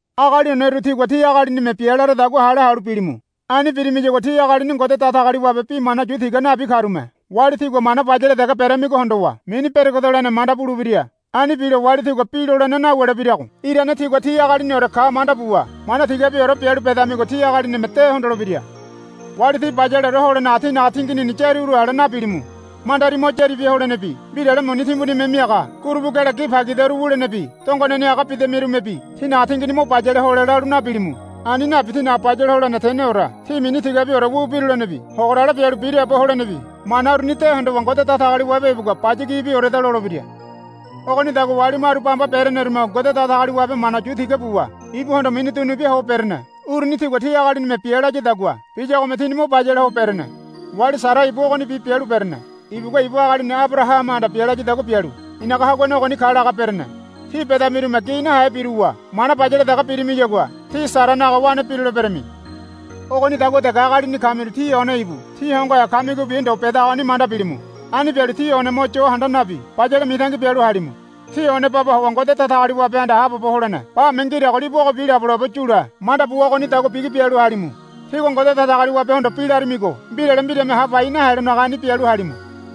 Agali oneru tígua tí agalinime bia laradagua hale halu bilimu. Ani birimiyagua tí agalini Ngode Datagaliwabe bi mana yu tiga nabi karume wali tígua mana bayale dege beramigo hondowa mini beregedolene manda bulebira. Ani bilo wali tígua bi lolene nawulebirago irane tígua tí agaliniore ka manda buwa mana tigabiore bialu bedamigo tí agalinime de hondolebira. Wali tí bayaleore holenaga tínaga tinginini yári uru ale nabilimu. Mandari mo yári bia holenebi mbirale muni timbunime miaga gurubu gele gi pagidaru wulenebi dongoneni aga bidamirumebi tínaga tingini mo bayale hole lalu nabilimu. Ani nabi tínaga bayale holene teneore tí mini tigabiore wu birulenebi hogorale bialu biraabo holenebi mana uruni de hondowa Ngode Datagaliwabe ibugua, Baya gibioreda, lolebira. Ogonidagua wali maru bamba berenerume Ngode Datagaliwabe mana yu tiga buwa ibuhondo mini dunubia ho berene. Uruni tigua ti agalinime bia layadagua biyagome tini mo bayale ho berene. Wali Sara ibu ogonibi bialu berene. Ibugua ibu agalini Abarahamahanda bia layadagua bialu, I̱naga haguane ogoni ka, laga berene. Tí bedamirume gi nahe biruwa mana bayale dege birimiyagua tí Saranaga wane biruleberami. Ogonidagua dege agalini kamiru tí one ibu tí hongohe kamigobi ndo bedagoni manda bilimu. Ani bialu tí one mo yo handa nabi bayale mitangi bialu halimu. Tí one baba howa Ngode Datagaliwabehanda haabobo holene bame ngirago libu ogobi labolabo yule manda buwa ogonidagua bigi bialu halimu. Tígua Ngode Datagaliwabehondo bi laramigo mbirale mbirame ha pai nahelonaga ani bialu halimu.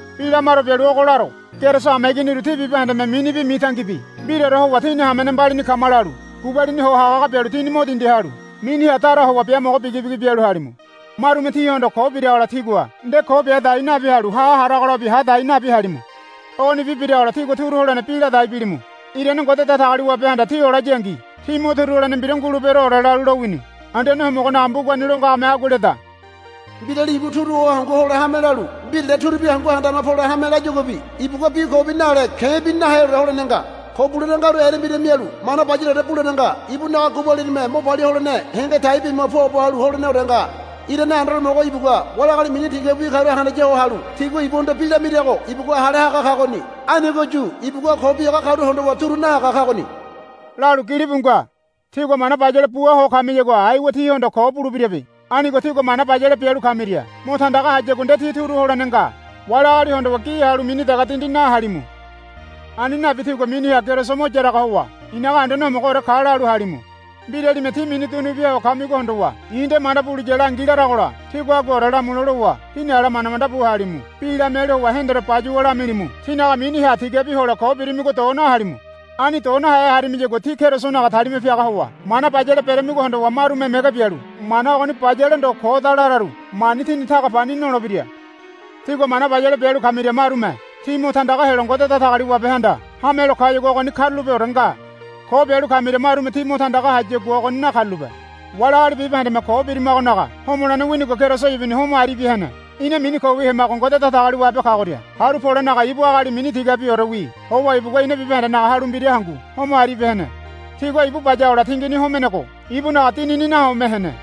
Bi lamaro bialu ogo laro. Keriso hameiginiru tí bibahendeme minibi mitangibi mbiraore howa tíni hamene mbalini kama lalu gubalini ho hagahaga bialu tíni mo dindi halu miniha dara howa biamogo bigibigi bialu halimu. Marume tíhondo ko biragola tígua nde ko bia dai nabi halu ha haragolabi ha hadai nabi halimu. Ogonibi biragola tígua turu holene bi ladai bilimu. Irane Ngode Datagaliwabehanda tí olayangi tí mo turu holene mbira nguleberoore lalu lowini. Anduane Homogonaga mbugani lo ngagome agua leda, Mbirali ibu turu ho hangu hole hame lalu mbirale turubi hangu handama pole hame layaguabi ibugua bi kobi nale ke̱bi naheore holene nga. Ko bulene ngaru erembira mialu mana bayaleore bulene nga. Ibunaga gubalinime mo palia holene henge tai bima puabo halu holeneore nga. Irane Anduane Homogo ibugua wali agali mini tigabiwi karu handaya ho halu tigua ibuhondo bi lamirago ibugua hale haga kagoni. Anigoyu ibugua ko biaga karu hondowa turu nahaga kagoni, lalu gilibu nga. Tígua mana bayale bua ho kamiyagua aiwa tíhondo ko bulebirabe. Anigo tígua mana bayale bialu kamiria mo tandaga hayagua nde tí turu holene nga. Wali agali hondowa gi halu mini dege dindi nahalimu. Ani nabi tígua miniha Keriso mo yaraga howa, I̱naga Anduane Homogoore ka, lalu halimu. Mbiralime tí mini dunubia ho kamigo hondowa, I̱ nde manda buliya langi, laragola tígua aguaore lamule lowa tíni ala manda manda bu halimu. Bi lamialu howa hendore bayuwa lamilimu. Tínaga miniha tigabi hole ko birimigo do nahalimu. Ani do nahe harimiyagua tí Kerisonaga talima piaga howa mana bayale beremigo hondowa marume mege bialu mana ogoni bayale ndo koda lararu mani tini taga pani nolebira. Tígua mana bayale bialu kamiria marume tí mo tandaga helo Ngode Datagaliwabehanda hamelo kayagua ogoni karulapeore nga. Ko bialu kamiria marume tí mo tandaga hayagua ogoni nakarulape. Wali agali bibahendeme ko birimagonaga homolene winigo Keriso ibuni homo aribia hene. Ina mini kowi hemago Ngode Datagaliwabe kagoria haru polenaga ibu agali mini tigabiorewi howa ibugua ina bibahendenaga halu mbira hangu homo aribia hene. Tigua ibu bayagola tingini homenego ibunaga dinini nahome hene.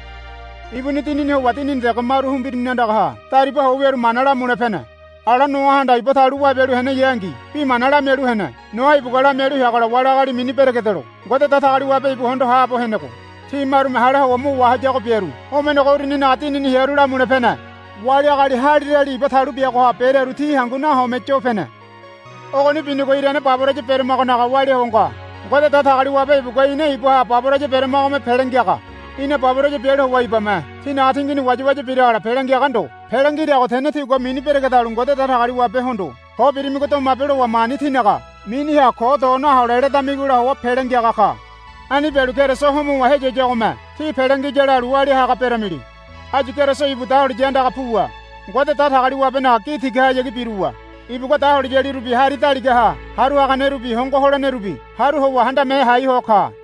Ibuni dinini howa dinini dege maru humbirini andaha dariba ho wiaru mana lamule pene. Ala Noahanda iba talu wabialu heneyangi bi mana lamialu hene. Noa ibugua lamialu heagola wali agali mini beregedelo Ngode Datagaliwabe ibugua hondo haabo henego ti marume hale howa mo wahayago biaru homenego uruninaga dinini hearu lamule pene. Wali agali halirali iba talu biagoha berearu ti hangu nahome yo pene. Ogoni binigo irane baboraya beremagonaga walia ho nga. Ngode Datagaliwabe ibugua ina ibaha baboraya beramagome pele ngiaga. Ina baboraya bialu howa ibame tinaga tingini wayawaya biragola pele ngiaga ndo. Pele ngirago tene tígua mini beregedalu Ngode Datagaliwabehondo, Ko birimago domabe, lowa mani tínaga miniha ko do nahole ledamigola howa pele ngiaga ka. Ani bialu Keriso homowa heyiyagome tí pele ngiya lalu walia haga beramili. Áyu Keriso ibu dahuliya andaga puwa Ngode Datagaliwabenaga gi tigahayagi biruwa ibugua dahuliyalirubi hari daligaha haru haganerubi hongo holenerubi haru howa handame hai ho ka.